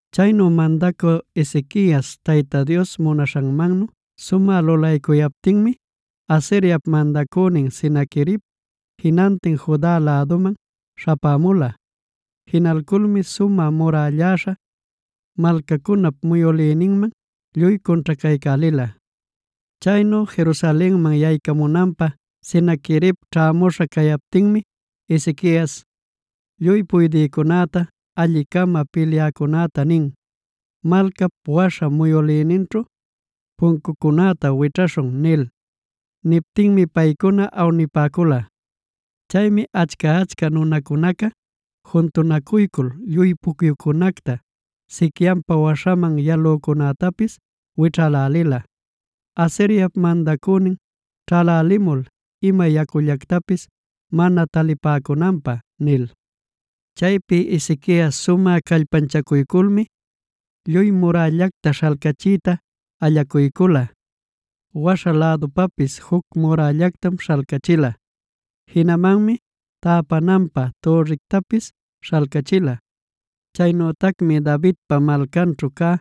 Chaynu mandacü Ezequias Tayta Dios munaśhanmannu sumä lulaycuyaptinmi, Asiriap mandacünin Senaquerib jinantin Juda läduman śhapämula. Jinalculmi sumä murälläśha malcancunap muyülïninman lluy cunćhacaycälila. Chaynu Jerusalenman yaycamunanpä Senaquerib ćhämuśha cacuyaptinmi Ezequias lluy puydïcunäta, alli-cama pilyäcunäta nin: “Malcap waśha muyülïninćhu pucyucunäta wićhäśhun” nil. Niptinmi paycuna awnipäcula. Chaymi achca-achca nunacuna juntunacuycul lluy pucyucunäta, siquianpa waśhaman yalücunätapis wićhälälila: “Asiriap mandacünin ćhalälimul ima yacullactapis mana talipäcunanpä” nil. Chaypi Ezequias sumä callpanchaculculmi lluy murällacta śhalcachiyta allacuycula. Waśha lädupapis juc murällactam śhalcachila. Jinamanmi täpananpä türrictapis śhalcachila. Chaynütacmi Davidpa Malcanćhu cä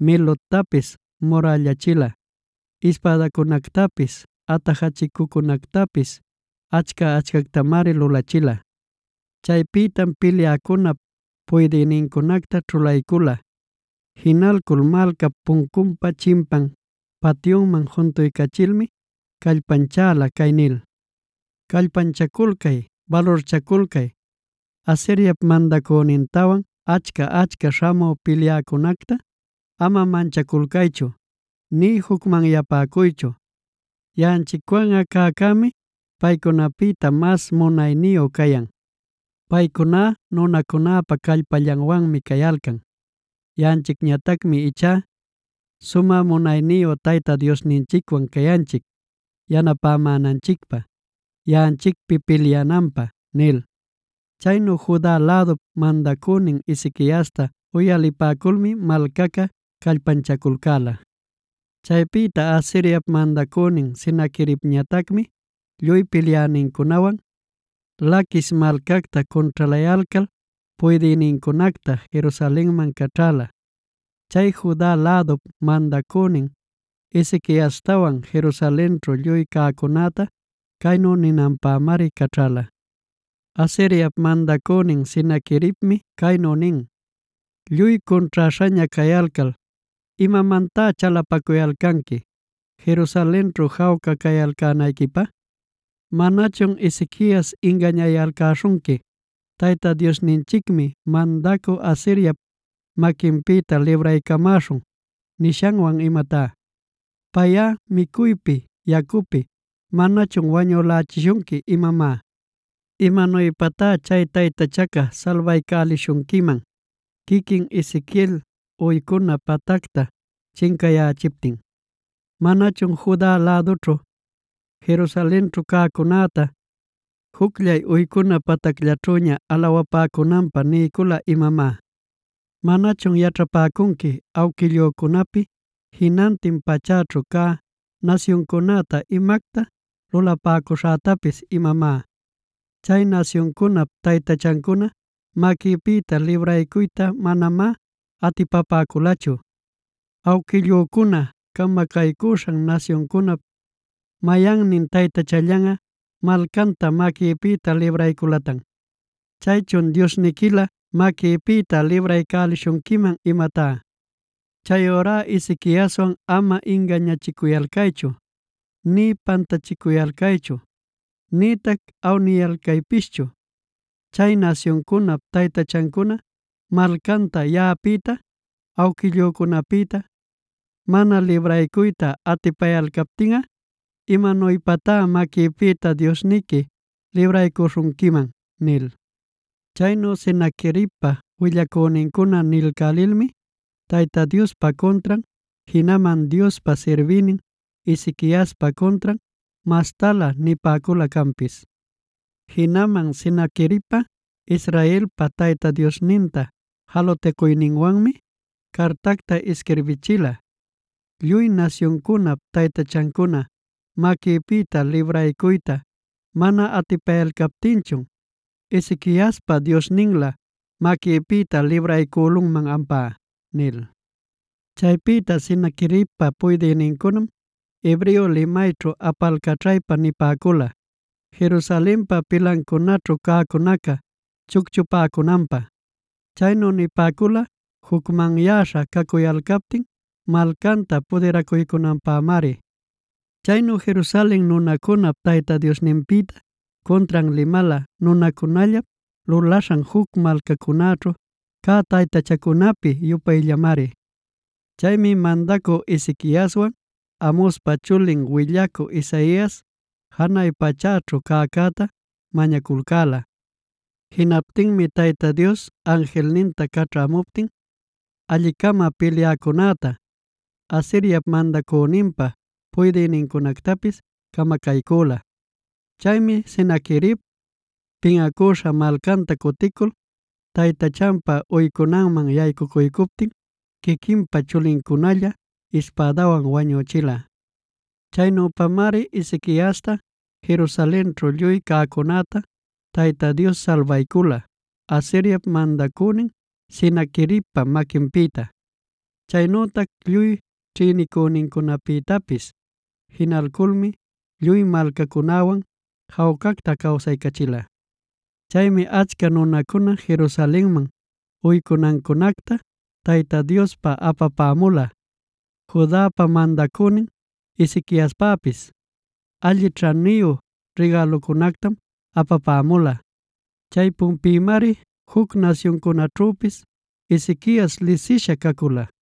Miloctapis murällachila; ispädacunactapis, atajachicucunactapis achca-achcactamari lulachila. Chaypïtam pilyäcunäpa puydïnincunacta ćhulaycula. Jinalcul malcap puncunpa chimpan patyuman juntuycachilmi callpanchäla cay nil: “Callpanchaculcay, balurchaculcay. Asiriap mandacünintawan achca-achca śhamü pilyänincunacta ama manchaculcaychu nï jucmanyapäcuychu. Yaꞌanchicwanꞌa cäcämi paycunapïta mas munayniyu cayan. Paycuná nunacunäpa callpallanwanmi cayalcan; yaꞌanchicñatacmi ichá sumä munayniyu Tayta Diosninchicwan cayanchic yanapamänanchicpä yaꞌanchicpi pilyananpä” nil. Chaynu Juda lädup mandacünin Ezequiasta uyalipäculmi malcaca callpanchaculcäla. Chaypïta Asiriap mandacünin Senaqueribñatacmi lluy pilyänincunawan Laquis malcacta cunćhalayalcal puydïnincunacta Jerusalenman caćhäla. Chay Juda lädup mandacünin Ezequiastawan Jerusalenćhu lluy cäcunäta caynu ninanpämari caćhala: “Asiriap mandacünin Senaqueribmi caynu nin: ‘Lluy cunćhäśhaña cayalcal, ¿imamantá chalapaculcanqui Jerusalenćhu jawca cayalcänayquipä? ¿Manachun Ezequias ingañayalcäśhunqui “Tayta Diosninchicmi mandacü Asiriap maquinpïta libraycamäśhun” nishanwan imatá? ¿Payꞌa micuypi yacupi manachun wañülächishunqui imamá? ¿Imanuypatá chay taytachaca salbaycälishunquiman quiquin Ezequiel uycuna patacta chincayächiptin? ¿Manachun Juda lädućhu, Jerusalenćhu cäcunäta jucllay uycuna patacllaćhüña alawaycunanpä niycula imamá? ¿Manachun yaćhapäcunqui awquillücunapi, jinantin pachäćhu cä nasyuncunäta imacta lulapäcuśhätapis imamá? Chay nasyuncunap taytachancuna maquïpïta libraycuyta manamá atipapäculachu. ¿Awquillücuna camacaycuśhan nasyuncunap mayannin taytachallanꞌa, malcanta maquïpïta librayculatan? Chaychun ¿diosniquilä maquïpïta libraycälishunquiman imatá? Chayurá Ezequiaswan ama ingañachicuyalcaychu nï pantachicuyalcaychu, nïtac awniyalcaypischu. Chay nasyuncunap taytachancuna malcanta yaꞌapïta, awquillücunapïta mana libraycuyta atipayalcaptinꞌa, ¿imanuypatá maquïpïta diosniqui libraycuśhunquiman?’” nil. Chaynu Senaqueribpa willacünincuna nilcälilmi Tayta Diospa cuntran, jinaman Diospa sirbïnin Ezequiaspa cuntran mastalä nipäcula canpis. Jinaman Senaqueribꞌa Israelpa Tayta Diosninta jalutacuyninwanmi cartacta isquirbichila: “Lluy nasyuncunap taytachancuna maquïpïta libraycuyta mana atipayalcaptinchun, ¿Ezequiaspa diosnillan maquïpïta libraycülunman ampá?” nil. Chaypïta Senaqueribpa puydïnincunam hebreo limayćhu apalcaćhaypa nipäcula Jerusalenpa pilancunaćhu cäcunaca chucchupäcunanpä. Chaynu nipäcula jucmanyäśha cacuyalcaptin malcanta pudiracuycunanpämari. Chaynu Jerusalen nunacunap Tayta Diosninpïtá cuntran limala nunacunallap lulaśhan juc malcacunaćhu cä taytachancunapi-yupayllamari. Chaymi mandacü Ezequiaswan Amozpa chulin willacü Isaias, janay pachäćhu cäcäta mañaculcäla. Jinaptinmi Tayta Dios anjilninta caćhämuptin alli-cama pilyäcunäta, Asiriap mandäninpa puydïnincunactapis camacaycüla. Chaymi Senaquerib pinꞌacüśha malcanta cutilcul taytachanpa uycunanman yaycuycuptin quiquinpa chulincunalla ispädawan wañüchila. Chaynüpamari Ezequiasta Jerusalenćhu lluy cäcunäta Tayta Dios salbaycula Asiriap mandacünin Senaqueribpa maquinpïta, chaynütac lluy ćhïnicünincunapïtapis. Jinalculmi lluy malcacunäwan jawcacta cawsaycachila. Chaymi achca nunacuna Jerusalenman uycunancunacta Tayta Diospa apapämula. Judapa mandacünin Ezequiaspäpis alli ćhaniyu rigälucunactam apapämula. Chaypunpïmari juc nasyuncunaćhüpis Ezequias lisisha cacula.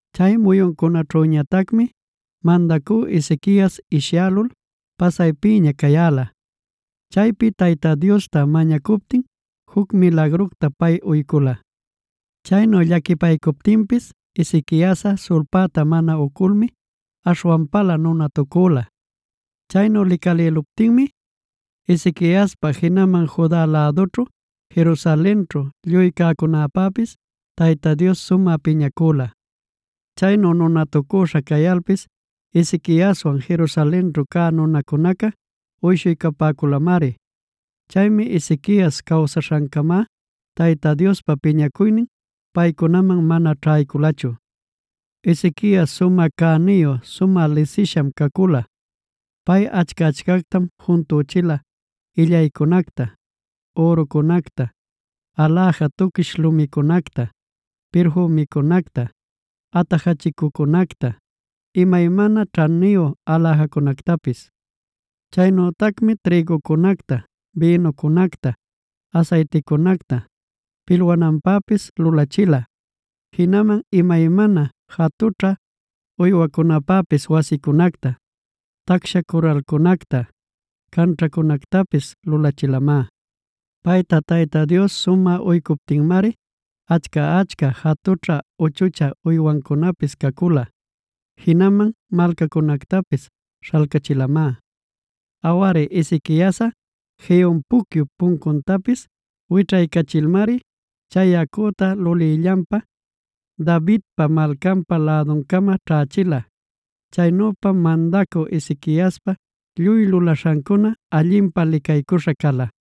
Chay muyuncunaćhüñatacmi mandacü Ezequias ishyälul pasaypiña cayäla. Chaymi Tayta Diosta mañacuptin juc milagructa pay uycula. Chaynu llaquipaycuptinpis Ezequiasꞌa sulpäta mana uculmi aśhwanpalä nunatucüla. Chaynu licalïluptinmi Ezequiaspa, jinaman Juda lädućhu, Jerusalenćhu lluy cäcunäpäpis Tayta Dios sumä piñacüla. Chaynu nunatucüśha cayalpis Ezequiaswan Jerusalenćhu cä nunacunaca uyshuycapäculamari. Chaymi Ezequias cawsaśhancama Tayta Diospa piñacuynin paycunaman mana ćhayculachu. Ezequias sumä cäniyu sumä lisisham cacula. Pay achca-achcactam juntüchila: illaycunacta, ürucunacta, aläja tuquish lumicunacta, pirfümicunacta, atajachicucunacta, imaymana ćhaniyu aläjacunactapis. Chaynütacmi trïgucunacta, bïnucunacta, asayticunacta pilwananpäpis lulachila. Jinaman imaymana jatućhä uywacunapäpis wasincunacta, tacsha curralcunacta, canćhancunactapis lulachilamá. Payta Tayta Dios sumä uycuptinmari achca-achca jatućhä uchuchä uywancunapis cacula; jinaman malcacunactapis śhalcachilamá. Awari, Ezequiasꞌa Gihon pucyup puncuntapis wićhaycachilmari chay yacucta lulïllanpa, Davidpa Malcanpa läduncama ćhächila. Chaynüpam mandacü Ezequiaspa lluy lulaśhancuna allinpä licaycuśha cala.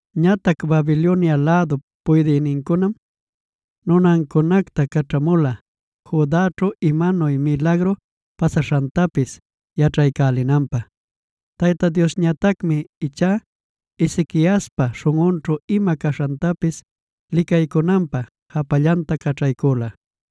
Ñatac Babilonia lädup puydïnincunam nunancunacta caćhamula Judaćhu imanuy milagru pasaśhantapis yaćhaycälinanpä. Tayta Diosñatacmi ichá Ezequiaspa śhunꞌunćhu ima caśhantapis licaycunanpä japallanta caćhaycüla.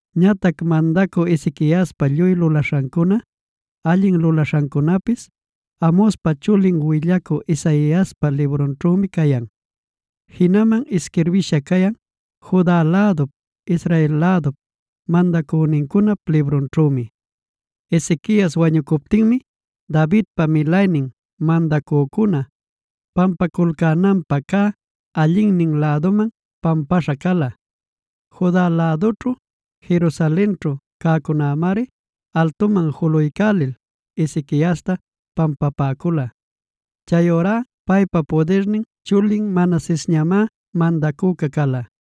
Ñatac mandacü Ezequiaspa lluy lulaśhancuna, allin lulaśhancunapis Amozpa chulin willacü Isaiaspa librunćhümi cayan; jinaman isquirbïsha cayan Juda lädup, Israel lädup mandacünincunap librunćhümi. Ezequias wañucuptinmi Davidpa milaynin mandacücuna pampaculcänanpä cä, allinnin lädunman pampaśha cala. Juda lädućhu, Jerusalenćhu cäcunämari altuman juluycälil Ezequiasta pampapäcula. Chayurá paypa pudirnin chulin Manasesñamá mandacüca cala.